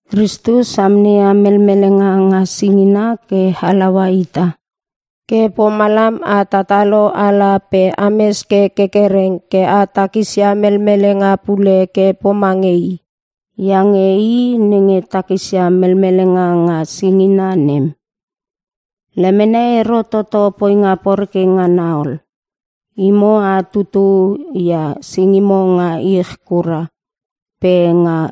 Kristus amneia melmelenga nga singina ke halaua ita, ke pomalam a tatalo ala pe ames ke kerkereng ke a takisia melmelenga pule ke pomange i. Iange i nenge takisia melmelenga nga singina nem, lemene ero toto poinga poreke ngana ol. Imo a tutu ia singimo nga ich kura pe nga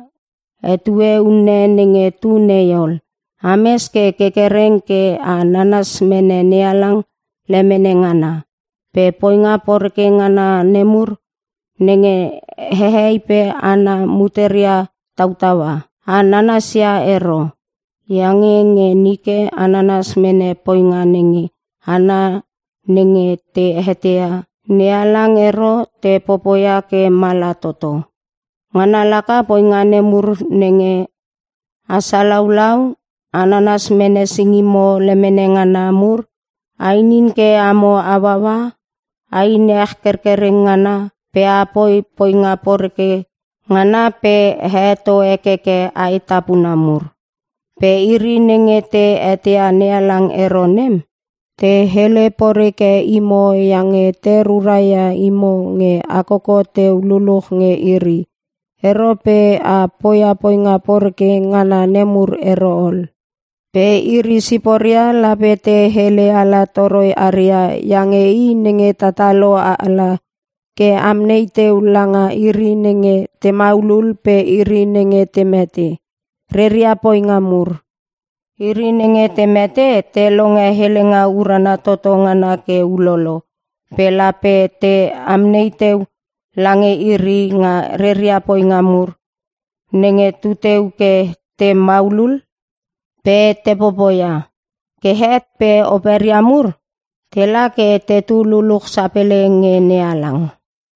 etue unne nenge tu nei ol, ames ke kerkereng ke a nanas mene NeHalang lemene ngana. Pe poinga poreke ngana nemur nenge hehei pe hana muteria tautaua, a nanasia ero. Iange nge nike a nanas mene poinga nenge hana nenge te eteia NeHalang ero te popoia ke mala toto. Ngana laka poinga nemur nenge: A salaulau, a nanas mene singimo lemene ngana mur, a inin ke amo hauaua, a inin ech kerkereng ngana pe a popoi poinga poreke ngana pe a heto hekeke ae tapuna mur. Pe iri nenge te eteia NeHalang ero nem, te hele poreke imo iange te ruraia imo nge a koko teu luluch nge iri ero pe a poia poinga poreke ngana nemur ero ol. Pe iri siporia lape te hele ala toroi aria lange i nenge tatalo ala ke amnei teu langa iri nenge te maulul pe iri nenge te mete reria poinga mur. Iri nenge te mete te longe helenga urana toto ngana ke ulolo pe lape te amnei teu lange iri nga reria poinga mur nenge tetu ke te maulul pe te popoia. Ke het pe operia mur tela ke tetu luluch sapele nge NeHalang.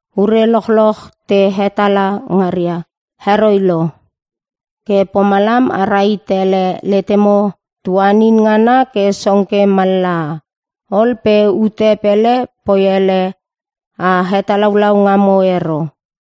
Ure lochloch te hetala ngaria heroi lo. Ke pomalam a rahit ele letemo tuanin ngana ke song ke mallaha ol pe ute pele poi ele a hetalaulau ngamo ero.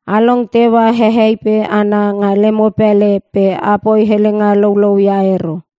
A long teua hehei pe hana nga lemo pele pe a poi helenga loulou ia ero.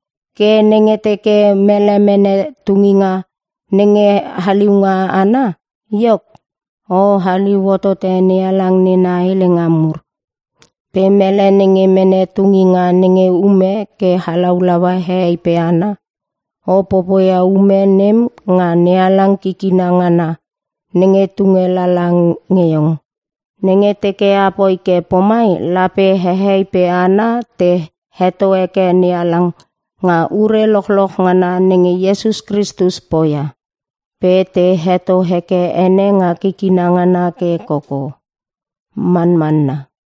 Ke nenge teke mele mene tunginga nenge haliunga ana, iok, o haliu hotote NeHalang nena helenga mur. Pe mele nenge mene tunginga nenge ume ke halaulaua hehei pe hana, o popoia ume nem nga NeHalang kikina ngana nenge tunge lala nge iong. Nenge teke a poi ke pomai lape hehei pe hana te heto heke NeHalang nga ure lochloch ngana nenge Iesus Kristus poia, pe te heto heke ene nga kikina ngana ke koko. Manmanna.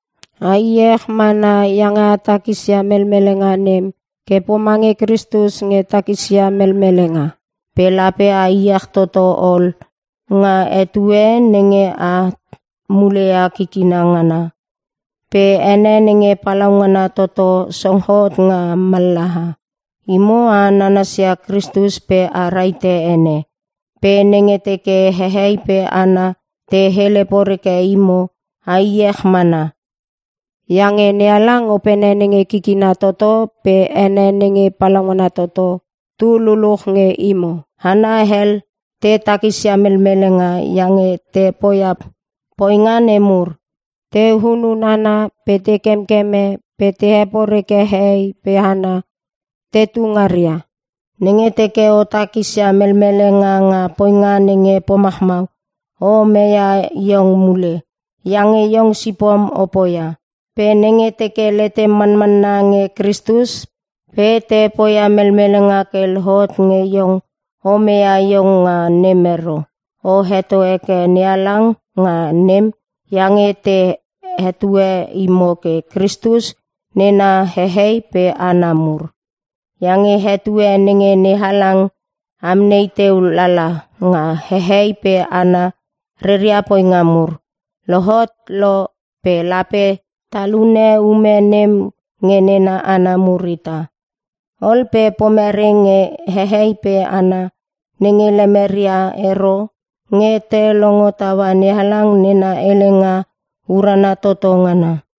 A iech mana iange a takisia melmelenga nem ke pomange Kristus nge takisia melmelenga. Pe lape a iech toto ol nga etue nenge at muleia kikina ngana pe ene nenge palaungana toto song hot nga mallaha. Imo a nanasia Kristus pe a rahite ene. Pe nenge teke hehei pe hana te hele poreke imo a iech mana, iange NeHalang Opene nenge kikina toto pe ene nenge palaungana toto, tu luluch nge imo. Hana hel te takisia melmelenga iange te poia poinga nemur: Te hunun hana pe te kemkeme pe te heporeke hehei pe hana tetu ngaria. Nenge teke o takisia melmelenga nga poinga nenge pomachmau, o meia iong mule iange iong sipom o poia. Pe nenge teke letem manmanna nge Kristus pe te poia melmelenga ke lohot nge iong o meia iong nga nem ero. O heto heke NeHalang nga nem iange te hetue imo ke ‘Kristus nena hehei pe hana mur’. Iange etue nenge NeHalang amnei teu lala nga hehei pe hana reria poinga mur lohot lo pe lape talune ume nem nge nena hana mur ita. Ol pe pomere nge hehei pe hana nenge lemeria ero nge te longo taua NeHalang nena helenga urana toto ngana?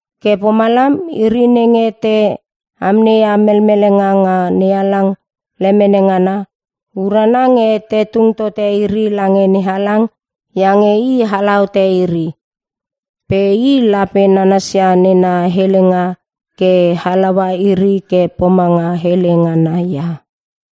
Ke pomalam iri nenge te amneia melmelenga nga NeHalang lemene ngana, urana nge te tung tote iri lange NeHalang iange i ala hote iri. Pe i lape nanasia nena helenga ke halaua iri ke pomanga hele ngana ia.